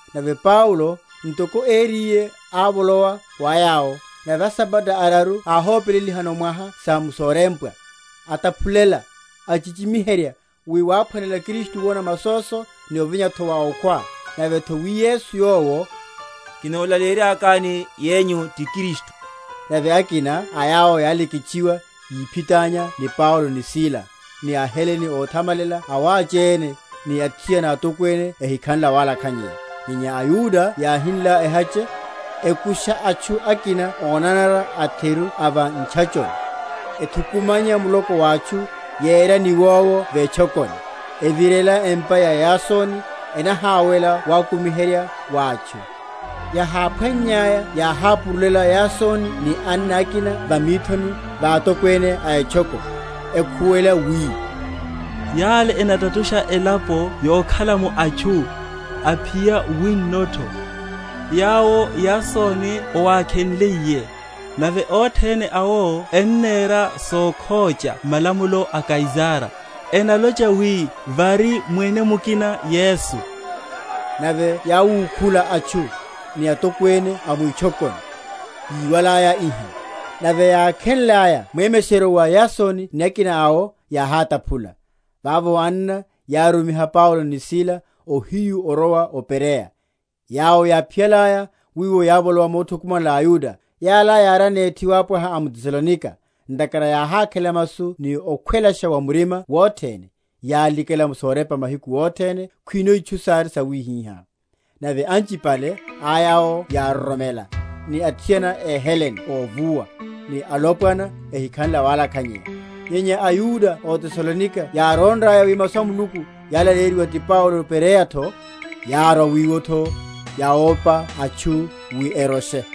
Nave Paulo, ntoko ériye, ávolowa wa yawo; nave asabata araru áhópelelihano mwaha sa m’sorepa, ataphulela, achichimiherya, wi wáphwanela Kristu wona masoso, ni ovinya’tho wa okhwa; nave’tho wi Yesu yowo, kinolaleyeryakani yenyu, ti Kristu. Nave akina a yawo yáleketchiwa, yiphitánya wa Paulo ni Sila; ni aHelene óthamalela awáchéne, ni athiana atokwene ehikhanle awalakhanyeya. Nyenya aYuda yáhinla ehache, ekusha atchu akina ónanara atheru a va ntchachoni, ethukumanya muloko wa atchu, yera niwowo vetchokoni; evirela empa ya Yasoni, enaháwela wakumiherya wa atchu. Yaháphwannyaya yáhapurulela Yasoni ni anna akina va mithoni va atokwene a etchoko, ekhuwela wi, Yale enatatusha elapo yokhala’mo atchu, aphiya wino’tho; yawo Yasoni owakhenliye; nave othene awo ennera sokhocha malamulo a Kaisara, enalocha wi, Vari mwene mukina, Yesu. Nave yáwukhula atchu, ni atokwene a mwitchokoni, yíwalaya iha. Nave yákhenlaya mwemesheryo wa Yasoni ni akina awo, yáhátaphula. Vavo anna yárumiha Paulo ni Sila ohiyu orowa o Bereya: yawo yáphiyalaya wiwo yávolowa mothukumanela aYuda. Yala yári anethi wapwaha a m’Tesalonika, ntakhara yáhákhela masu ni okhwelasha wa murima wothene, yalikhela m’sorepa mahiku othene, khwino itchu sári sawihiha. Nave anchipale a yawo yároromela; ni athiana éHelene óvuwa, ni alopwana, ehikhanle awalakhanyeya. Nyenya aYuda ó Tesalonika yárónraya wi Masu a Muluku yálaleyeryiwa ti Paulo o Bereya’tho, yárwa wiwo’tho, yawopa atchu wi eroshe.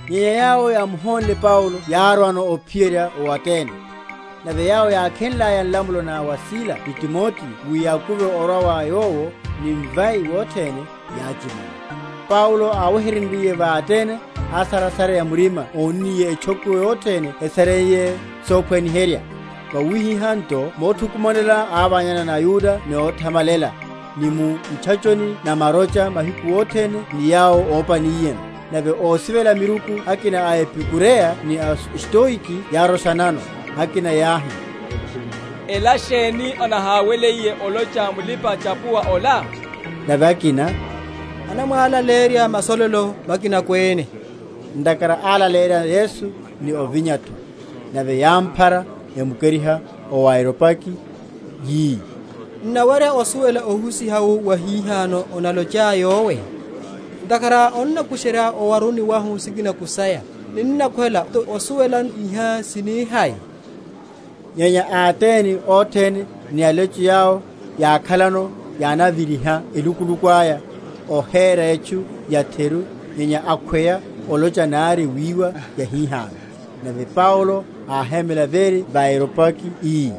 Nyenya yawo yámuhonle Paulo yárwano ophiyerya o Atene; nave yawo yákhenlaya nlamulo na wa Sila ni Timoteo wi yakuve orwa wa yowo ni mvai wothene, yáchimula. Paulo áwehenryiye va Atene, ásarasareya murima ónniye etchoko yothene esareiye sophwaniherya. Vawihiha nto mothukumanela ávanyana ni aYuda ni óthamalela, ni mu ntchachoni na marocha mahiku othene ni yawo ópaniyeno. Nave ósivela miruku akina a Epekureya ni a Stoiki yároshanano. Akina yáhi, Ela sheni anaháweliye olocha mulipa‐chapuwa ola? Nave akina, anamwalaleyerya masololo makinako ene, ntakhara álaleyerya Yesu ni ovinya’tho. Nave yámphara, emukeriha o Areopagi, yi, N’nawerya osuwela ohusiha wu wahihano onalochá yowe? Ntakhara onnakusherya owaruni wahu sikinako saya: ninnakhwela nto osuwela, iha sini hai? (Nyenya aAtene othene ni alecho yawo yákhalano yánaviriha elukuluku aya, óhéra etchu yatheru nyenya akhweya olocha nari wiwa yahihano.) Nave Paulo áhémela véri va Areopagi ii,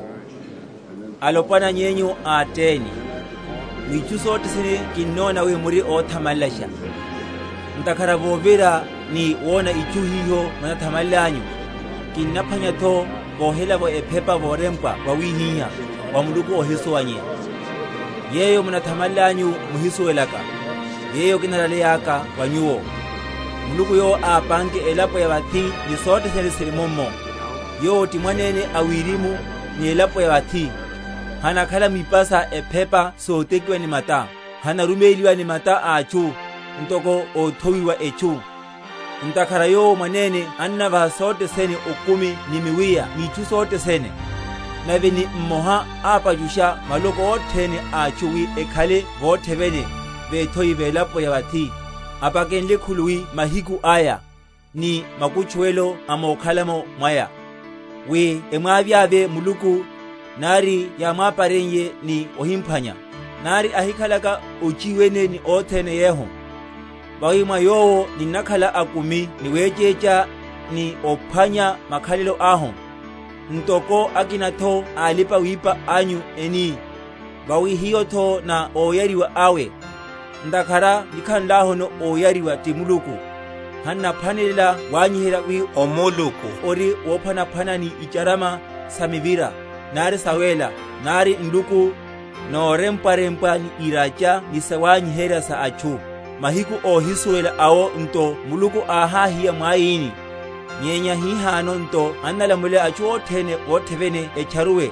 Alopwana yenyu a Atene, mwitchu sothe sene kinnona wi muri óthamalelasha. Ntakhara vovira, ni wona itchu hiho munathamalelanyu, kinnaphwanya’tho vohelavo ephepa vorempwa vawihiha, WA MULUKU ÓHISUWANYEYA. Yeyo munathamalelanyu muhisuwelelaka, yeyo kinalaleyeryaka wa nyuwo. Muluku yowo ápanke elapo ya vathi ni sothe sene siri mummo, Yowo, ti mwanene a wirimu ni elapo ya vathi, hanakhala mwipa sa ephepa sotekiwa ni mata; hanaruméliwa ni mata a atchu, ntoko óthowiwa etchu, ntakhara yowo mwanene annavaha sothe sene okumi ni miwiya ni itchu sothene; nave ni mmoha ápachusha maloko othene a atchu, wi ekhale vothe vene vethoini velapo ya vathi, apakenle khuluwi mahiku aya, ni makutchuwelo a mokhala’mo mwaya; wi emwavyavye Muluku, nari yamwapareye ni omphwanya, nari ahikhalaka ochiwene ni othene yehu: vawi mwa Yowo ninnakhala akumi ni wechecha, ni ophwanya makhalelo ahu; ntoko akina’tho a alipa‐wipa awinyu eni, Vawi hiyo’tho ná óyariwa awe. Ntakhara nikhanlahu óyariwa ti Muluku, han’naphwanela wanyiherya wi omuluku ori wophwanaphwana ni icharama sa mivira, nari sawéla, nari nluku, norempwarempwa ni iracha ni sawanyiherya sa atchu. Mahiku óhísuwela awo nto Muluku áhahiya mwaini; nyenya hihano nto annalamulela atchu othene vothe vene etcharuwe: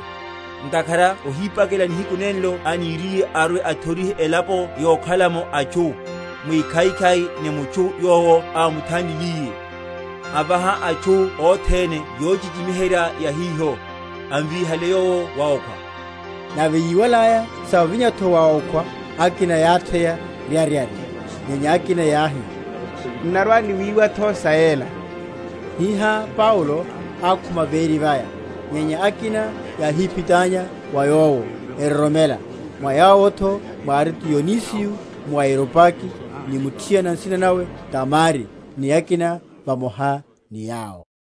ntakhara ohipakela nihiku nenlo aniriye arwe‐athorihe elapo yokhala’mo atchu, mwikhaikhai ni mutchu yowo ámuthanlile; avaha atchu othene yochichimiherya ya hiho, ámvíhaliye Yowo wa okhwa. Nave yíwalaya sa ovinya’tho wa okhwa akina yátheya ryaryarya; nyenya akina yáhi, N’narwa‐niwiwa’tho sa yela. Hihá Paulo ákhuma véri vaya. Nyenya akina yáhíphitanya wa yowo, eroromela; mwa yawo’tho mwári Dionisiyo muAreopagi, ni muthiana nsina nawe Damari, ni akina vamoha ni yawo.